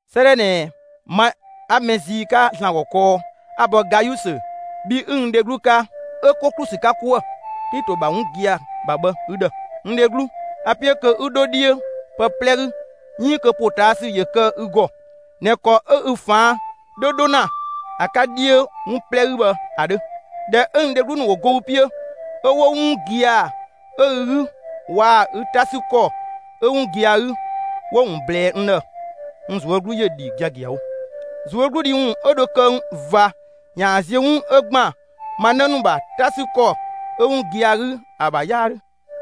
'Sëëdhɛ ꞊nɛ, ma 'a mɛ zii 'ka ‑Zlan ‑gɔ kɔɔ 'a‑ bɔ Gayusö, bhi 'ü n dheglu 'ka, 'ö 'ko ‑klu ‑sü 'ka 'kuë‑ Klito ‑bha 'wun gia‑ ‑bha bhë, ü ‑dhë. N dheglu, a‑ 'piö kö 'ü 'dho 'dhiö pë 'plɛ 'gü, 'iin kö ‑potaasü ‑yö kë ü ‑gɔ ꞊nɛ ‑kɔ 'ö ü ꞊faan' 'dhö 'dho ‑na ‑a 'ka 'dhiö 'wun 'plɛ 'gü bhë ‑a 'dhö. ꞊Dhɛ 'ö n dheglu ‑nu ‑wo go ü 'piö 'ö 'wo 'wun gia‑ 'ö ü 'gü waa‑ ü 'ta ‑sü ‑kɔ 'ö 'wun gia‑ 'gü 'wo‑ ‑wun ꞊blɛɛ n ‑dhë, n ꞊zuö' 'glu ‑yö ‑dhi giagiawo. ꞊Zuögludhi ‑wun 'ö dho kë ꞊va ‑yaan zië 'wun 'ö ‑gban ma 'në ‑nu ‑bha 'ta 'sü ‑kɔ 'ö 'wun gia‑ 'gü ‑a ‑bha 'yaa ‑dhö.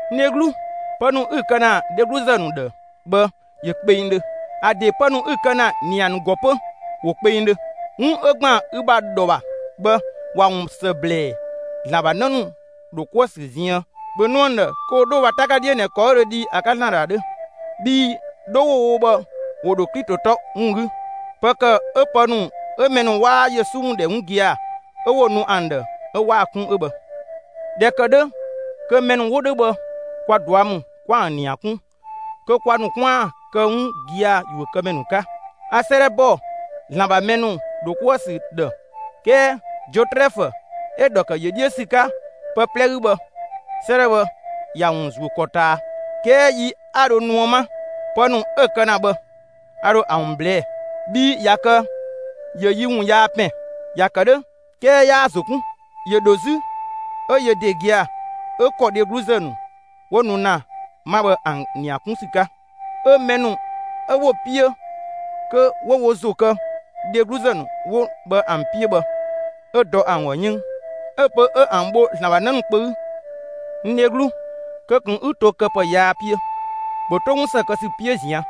N dheglu, pë ‑nu 'ü‑ kë ‑na dhegluzë ‑nu ‑dhë bhë, ‑yö kpengdhö. ‑A ‑de pë ‑nu 'ü‑ kë ‑na ‑nia ‑nu ‑gɔ 'pö ‑wo kpengdhö. 'Wun 'ö ‑gban ü ‑bha ‑dhɔ ‑bha bhë, ‑wa ‑wun ‑së ‑blɛɛ ‑Zlan ‑bha 'në ‑nu ‑dho 'kuë‑ ‑sü ziën. ‑Bhö nu ‑an ‑dhë kö ‑wo 'dho wo ‑bha 'ta 'ka 'dhiö ꞊nɛ ‑kɔ 'ö dho dhi ‑a 'ka ‑Zlan ‑dhë ‑a 'dhö. Bhii 'dho 'wo‑ wo bhë, ‑wo ‑dho Klito 'tɔ ‑wun 'gü. Pë ‑kë 'ö pë ‑nu 'ö mɛ ‑nu 'ö 'waa Yesu ‑wun ‑dhɛ 'wun gia‑ 'ö 'wo‑ nu ‑an ‑dhë 'ö 'waa‑ 'kun 'ö bhë. ꞊Dhɛ ‑kë 'dhö kö mɛ ‑nu 'wo 'dhö bhë, kwa ꞊dua' ‑mü 'kwa ‑an ‑nia ꞊kun kö kwa ‑nu 'kwaan‑ kë 'wun gia‑ ‑yuökëmɛ ‑nu 'ka. A 'sëëdhɛ ‑bɔ ‑Zlan ‑bha mɛ ‑nu ‑dho 'kuë‑ ‑sü ‑dhë, 'kɛɛ Diotrɛfö 'ö‑ ‑dhɔ ‑kë ‑yö 'dhiö ‑sü 'ka pë 'plɛ 'gü bhë, 'sëëdhɛ bhë, ‑ya ‑wun ‑zuö ‑kɔ ꞊taa. 'Kɛɛ yi 'a dho nuë 'ma, pë ‑nu 'ö‑ kë ‑na bhë a ‑dho ‑a ‑wun ꞊blɛɛ'‑; bhii ꞊ya kë ‑yö yi ‑wun yaa ‑pɛn. ‑Ya ‑kë 'dhö 'kɛɛ 'yaa‑ ‑zo 'kun. ‑Yö ‑dho 'zü 'ö yö ‑de gia‑ 'ö ‑kɔ dhegluzë ‑nu 'wo nu ‑na 'ma bhë ‑an ‑nia 'kun ‑sü 'ka; 'ö mɛ ‑nu 'ö 'wo‑ 'piö kö 'wo wo ‑zo kë dhegluzë ‑nu 'wo bhë ‑an 'piö bhë, 'ö dɔ ‑an ‑gɔ 'yënng; 'ö‑ pö 'ö ‑an bho ‑Zlan ‑bha 'në ‑nu kpö 'gü. N dheglu, kö ꞊kun 'ü to këpë yaa 'piö! ‑Bhö 'to 'wun ‑së kë ‑sü 'piö ꞊zian'!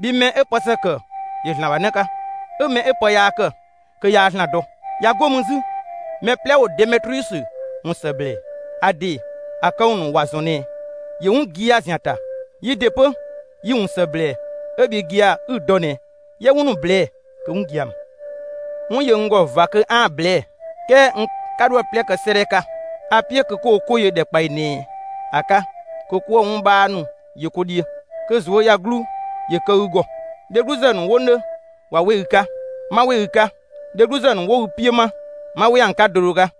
Bhii mɛ 'ö pë ‑së ‑kë ‑yö ‑Zlan ‑bha 'në 'ka; 'ö mɛ 'ö pë yaa ‑kë 'ö yaa ‑Zlan dɔ. ꞊Ya 'go mü 'zü, mɛ 'plɛ ‑wo Demetriusö ‑wun ‑së ‑blɛɛ. ‑A ‑de, ‑a këwun ‑nu ‑wa ‑zɔn ꞊nɛ ‑yö 'wun gia‑ ‑zian ‑ta. Yi ‑de 'pö, yi‑ ‑wun ‑së ‑blɛɛ 'ö bhi gia‑ 'ü‑ dɔ ꞊nɛ 'yië 'wun ‑nu ꞊blɛɛ'‑ kö 'wun gia‑ ‑mü. 'Wun ‑yö n ‑gɔ ꞊va 'aan‑ ꞊blɛɛ'‑, 'kɛɛ n 'ka 'dho ‑a 'plɛ kë 'sëëdhɛ 'ka. A‑ 'piö kö 'ko ko 'ko yö ‑dhɛkpaɔyi ꞊nɛ ‑a 'ka kö 'kuë‑ 'wun 'bhaa ‑nu yö 'ko 'dhiö. Kö ꞊zuöyagluu ‑yö kë ü ‑gɔ. Dhegluzë ‑nu 'wo 'nö ꞊wa 'we ü 'ka! 'Ma 'we ü 'ka; dhegluzë ‑nu 'wo ü 'piö 'ma, 'ma 'we ‑an 'ka do do 'ka!